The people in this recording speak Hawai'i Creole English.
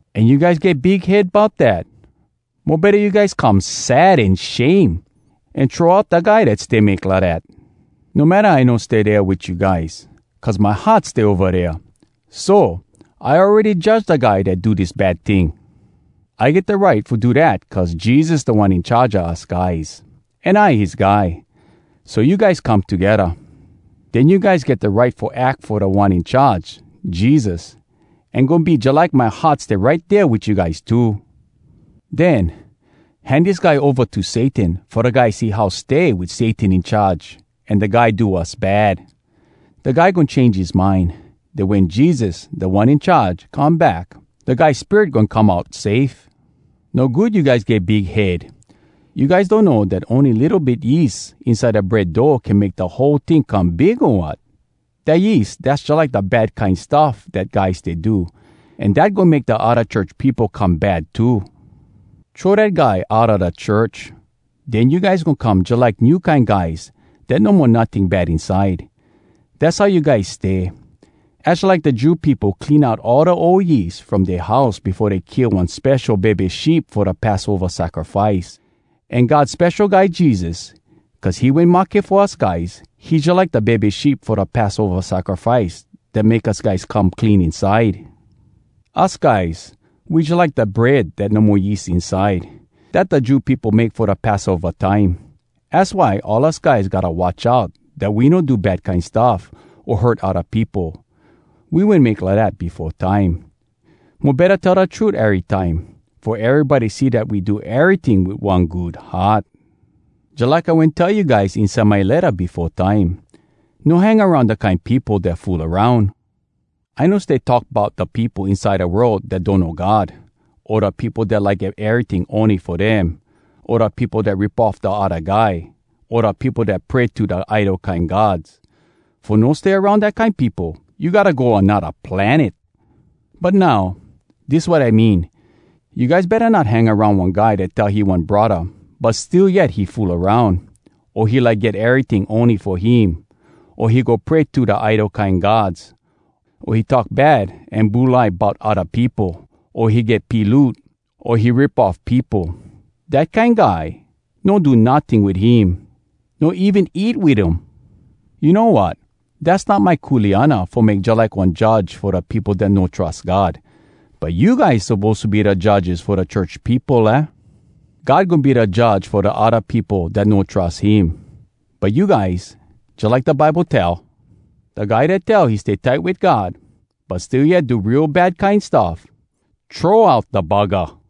An you guys get big head bout dat! Mo betta you guys come sad an shame, an throw out da guy dat stay make lidat. No matta I no stay dea wit you guys, cuz my heart stay ova dea. So, I awready judge da guy dat do dis bad ting. I get da right fo do dat cuz Jesus Da One In Charge a us guys, an I his guy. So you guys, come togedda. Den you guys get da right fo ack fo Da One In Charge, Jesus. An goin be jalike my heart stay right dea wit you guys too. Den, hand dis guy ova to Satan fo da guy see how stay wit Satan in charge an da guy do wass bad. Da guy goin change his mind. Den wen Jesus, Da One In Charge, come back, da guy spirit goin come out safe. No good you guys get big head! You guys donno dat ony litto bit yeast inside da bread dough can make da whole ting come big, o wat? Da yeast, dass jalike da bad kine stuff dat guy stay do. An dat goin make da odda church peopo come bad too. Throw dat guy outa da church. Den you guys goin come jalike new kine guys dat no mo notting bad inside. Dass how you guys stay. Az jalike da Jew peopo clean out all da ol yeast from dea house befo dey kill one spesho bebe sheep fo da Passova sacrifice. An God Spesho Guy Jesus, cuz he wen mahke fo us guys, he jalike da bebe sheep fo da Passova sacrifice dat make us guys come clean inside! Us guys, we jalike da Bread Dat No Mo Yeast Inside, dat da Jew peopo make fo eat Passova time. Az why all us guys gotta watch out dat we no do bad kine stuff, o hurt odda peopo. We wen make lidat befo time. Mo betta tell da trut erytime, fo erybody see dat we do eryting wit one good heart. Jalike I wen tell you guys inside my letta befo time, “No hang aroun da kine peopo dat fool aroun.” I no stay talk bout da peopo inside da world dat donno God, o da peopo dat like get eryting ony fo dem, o da peopo dat rip off da odda guy, o da peopo dat pray to da idol kine gods. Fo no stay aroun dat kine peopo, you gotta go anodda planet! But now, dis wat I mean: you guys betta not hang aroun one guy dat tell he one braddah, but still yet he fool aroun, o he like get eryting ony fo him, o he go pray to da idol kine gods, o he talk bad an bulai bout odda peopo, o he get piloot, o he rip off peopo. Dat kine guy, no do notting wit him—no even eat wit um! You know wat? Dass not my kuleana fo make jalike one judge fo da peopo dat no trus God. But you guys suppose to be da judges fo da church peopo, aah? God goin be da Judge fo da odda peopo dat no trus him. But you guys, jalike da Bible tell, “Da guy dat tell he stay tight wit God, but still yet do real bad kine stuff, throw out da buggah!”